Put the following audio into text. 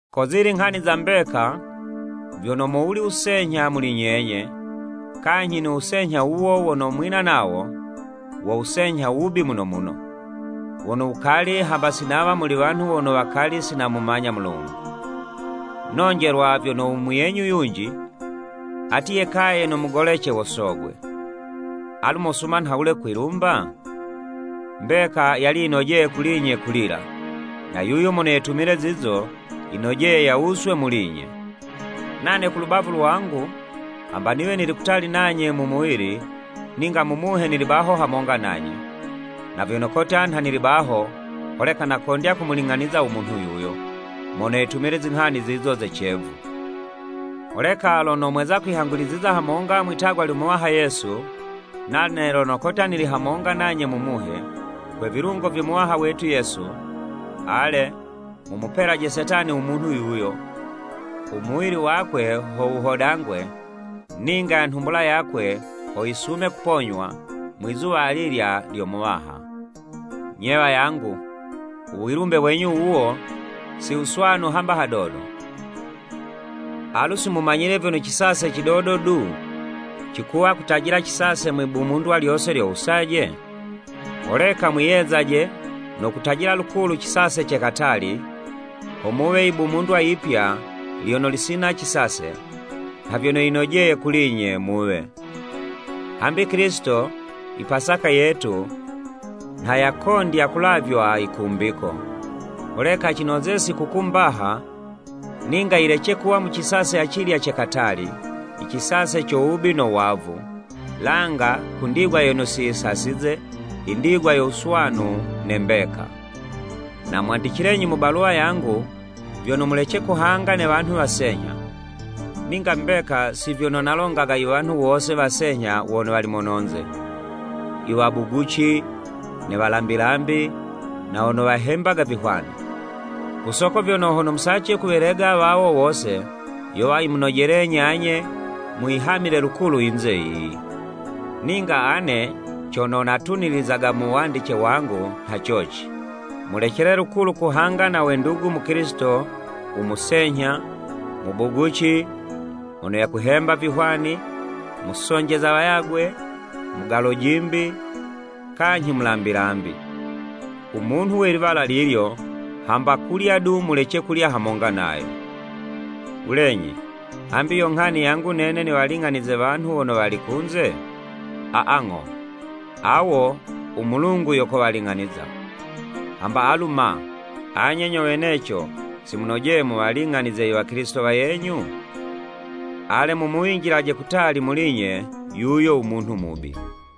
Ko zili nghani za mbeka, vyono, mowuli wusenyha muli nyenye, kanyhi no wusenyha wuwo wono mwina nawo, wo wusenyha wubi muno muno, wono wukali hamba si nawa muli wanhu wono wakali si namumanya Mulungu. Nonjelwa vyono u muyenyu yunji, ati yekaye no mugolece wo sogwe! Alu mosuma nhawule kwilumba? Mbeka, yali yinojeye kuli'nye kulila, na yuyo mono yetumile zizo, yinojeye yawuswe muli'nye. Nane ku lubavu lwangu, hamba niwe nili kutali nanye mu muwili, ninga mu muhe nili baho hamonga nanye, na vyono kotya nha nili baho, holeka nakondya kumuling'aniza u munhu yuyo, mono yetumile zinghani zizo ze cevu. Holeka lono mweza kwihanguliziza hamonga mwi'tagwa lyo Muwaha Yesu, nane lono kotya nili hamonga nanye mu Muhe, kwe vilungo vyo Muwaha wetu Yesu, ale, mumupelaje Setani u munhu yuyo, u muwili wakwe ho wuhodangwe, ninga nhumbula yakwe, ho yisume kuponywa, mwi'zuwa alilya lyo Muwaha. Nye wayangu, u wilumbe wenyu wuwo, si wuswanu hamba hadodo! Alu si mumanyile vyono cisase cidodo du, cikuwa kutajila cisase mwibumundwa lyose lyo wusaje? Holeka mwiyezaje no kutajila lukulu cisase ce katali, ho muwe yibumundwa yipya lyono lisina cisase, nha vyono yinojeye kuli'nye muwe. Hambi Kilisito, i Pasaka yetu, nha yakondya kulavywa yikumbiko. Holeka cinoze sikukuu mbaha, ninga yilece kuwa mu cisase acilya ce katali, i cisase co wubi no wavu, langa ku ndigwa yono si yisasize, i ndigwa yo wuswanu ne mbeka. Namwandicilenyi mu baluwa yangu, vyono mulece kuhanga ne wanhu wasenyha. Ninga mbeka, si vyono nalongaga i wanhu wose wasenyha wono wali mononze, i wabuguci, ne walambilambi na wono wahembaga vihwani. Ku soko vyono, hono musace kuwelega wawo wose, yowa yimunojelenyi anye, muyihamile lukulu yinze yiyi! Ninga ane cono natunilizaga mu wandice wangu nha coci, mulecele lukulu kuhanga na we ndugu Mukilisito, u musenyha, mubuguci, mono yakuhemba vihwani, musonjeza wayagwe, mugalo'jimbi, kanyhi mulambilambi. U munhu we liwala lilyo, hamba kulya du, mulece kulya hamonga nayo. Wulenyi, hambi yo nghani yangu nene niwaling'anize wanhu wono wali kunze? Aa, ng'o, awo u Mulungu yo kowaling'aniza. Hamba alu ma, anye nyo weneco si munojeye muwaling'anize i Wakilisito wayenyu? Ale mumuwinjilaje kutali muli'nye yuyo u munhu mubi!